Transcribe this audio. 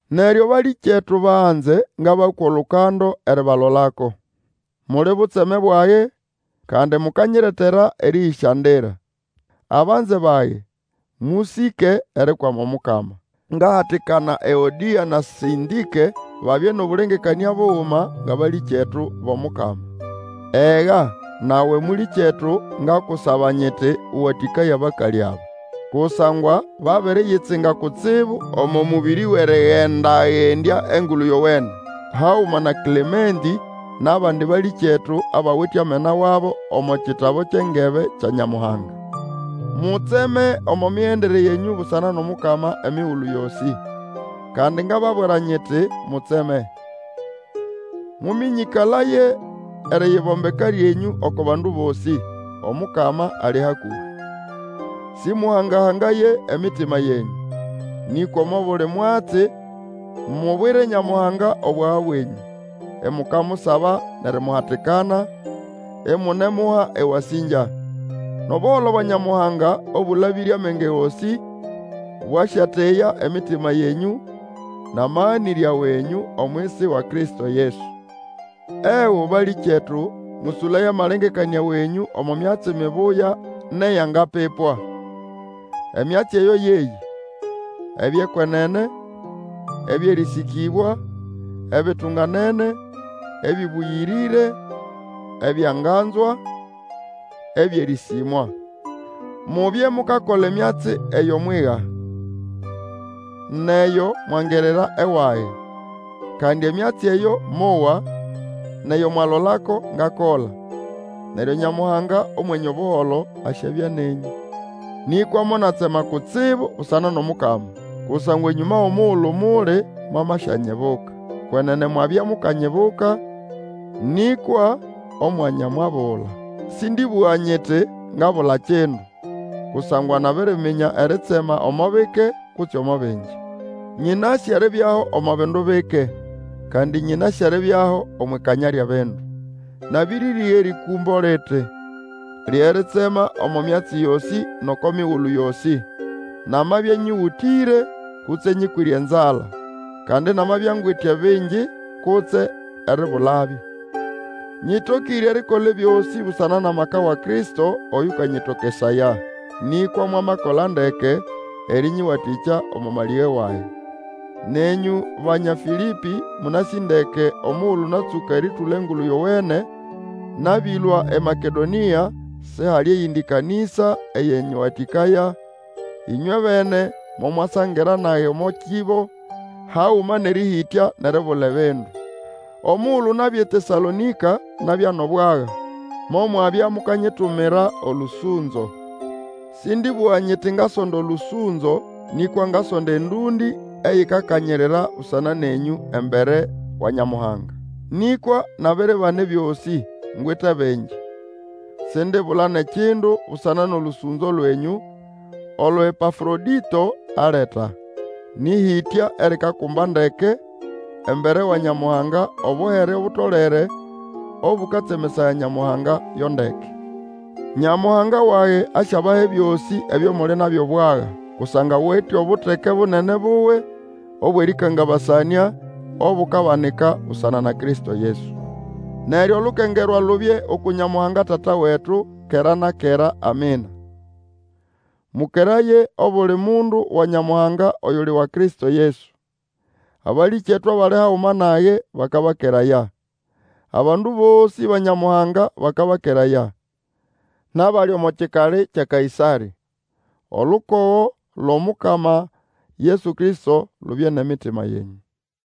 Neryo, balĩkyetu banze, ngabakwa olukando eribalolako. Muli butseme bwage, kandi mukanyiretera erĩyĩsyandira. Abanze bage, mũsĩke erikwama Omukama. Ngahatikana Eodĩa na Sĩntĩke babye nʼobũlengekanĩa buguma ngʼabalĩkyetu bʼOmukama. Ega, nawe mũlĩkyetu, ngakusaba nyiti, ũwatĩkaye abakalĩ aba. Kusangwa babiriyitsinga kutsibu omo mũbĩrĩ wʼerĩgenda-gendya Engulu Yowene, haguma na Klementĩ, nʼabandi balĩkyetu, abawite amena wabo omo kitabu kyʼengebe kya Nyamuhanga. Mutseme omo migendere yenyũ busana nʼOmukama emigulu yosĩ; kandi ngababwira nyiti, Mutseme! Mũmĩnyĩkalaye eriyibombeka lyenyũ oko bandu bosĩ, Omukama ali hakũhĩ! Sĩmũhanga-hangaye emitima yenyũ, nĩkwa omo buli mwatsi mubwire Nyamuhanga obwaga bwenyũ, imukamusaba nʼerimuhatikana, imunemuha ewasĩngya. Nʼobuholo bwa Nyamuhanga, Obũlabĩre amenge gosĩ, bwasyateya emitima yenyu nʼamaganĩrya wenyũ omwisi wa Kristo Yesu. Ego, balĩkyetu, mũsũlaye amalengekanĩa wenyũ omo myatsi mibuya nʼeyangapipwa. Emyatsi eyo yeyĩ: ebyʼekwenene, ebyʼerĩsĩkĩbwa, ebitunganene, ebĩbũyĩrĩre, ebyanganzwa, ebyʼerĩsĩmwa. Mubye mukakola emyatsi eyo mwiga, nʼeyo mwangirira ewage, kandi emyatsi eyo mowa, nʼeyo mwalolako ngakola. Neryo Nyamuhanga Omwenye Obuholo asyabya nenyũ. Nĩkwa monatsema kutsibu busana nʼOmukama, kusangwa enyũma wʼomugulu muli mwamasyanyibuka. Kwenene mwabya mukanyibuka, nĩkwa omwanya mwabula. Sĩndĩbũga nyiti ngabula kindu; kusangwa nabiriminya eritsema omo bike kutse omo bingi. Nyĩnasĩ eribyaho omo bindu bike, kandi nyĩnasĩ eribyaho omwʼikanya lyʼebindu. Nabiriga erĩkũmbo liti, lye ritsema omo myatsi yosĩ nʼoko migulu yosĩ, namabya nyĩgũtĩre, kutse nyĩkwĩre enzala; kandi namabya ngwite bingi kutse eribulabyo. Nyĩtokĩre erikola ebyosĩ busana nʼamaka wa Kristo oyũkanyĩtokesaya. Nĩkwa mwamakola ndeke erĩnyĩwatĩkya omo malĩge wage. Nenyũ, Banya Fĩlĩpĩ, mũnasĩ ndeke, omugulu natsũka erĩtũla Engulu Yowene, nabĩlũa eMakedonĩa, sihali eyindi kanĩsa eyanyĩwatĩkaya, ĩnywebene mo mwasangira nage omo kĩbo, haguma nʼerĩhĩtya nʼeribula ebindu. Omugulu nabya eTesalonĩka nabya nʼobwaga, momwabya mukanyitumira olũsũnzo. Sĩndĩbũga nyiti ngasonda olũsũnzo, nĩkwa ngasonda endũndĩ eyikakanyirira busana nenyũ embere wa Nyamuhanga. Nĩkwa nabiribana ebyosĩ, ngwite bingi; sindibula nʼekindu busana nʼolũsũnzo lwenyũ, olo Epafrodito aleta. Nĩ ʼhĩtya erikakumba ndeke, embere wa Nyamuhanga obuhere obutolere, obũkatsemesaya Nyamuhanga yo ndeke. Nyamuhanga wage asyabaha ebyosĩ ebyo muli nabyo bwaga, kusangwa awite obuteke bunene buwe, obwʼerĩkangabasanĩa, obukabanika busana na Kristo Yesu. Neryo olukengerwa lubye uku Nyamuhanga Tata wetu, kera na kera. Amina. Mũkeraye obuli mundu wa Nyamuhanga oyuli wa Kristo Yesu. Abalĩkyetu abali haguma nage bakabakeraya. Abandu bosĩ ba Nyamuhanga bakabakeraya. Nʼabali omo kikali kya Kaĩsarĩ. Olukogo lwʼOmukama Yesu Kristo lubye nʼemitima yenyũ.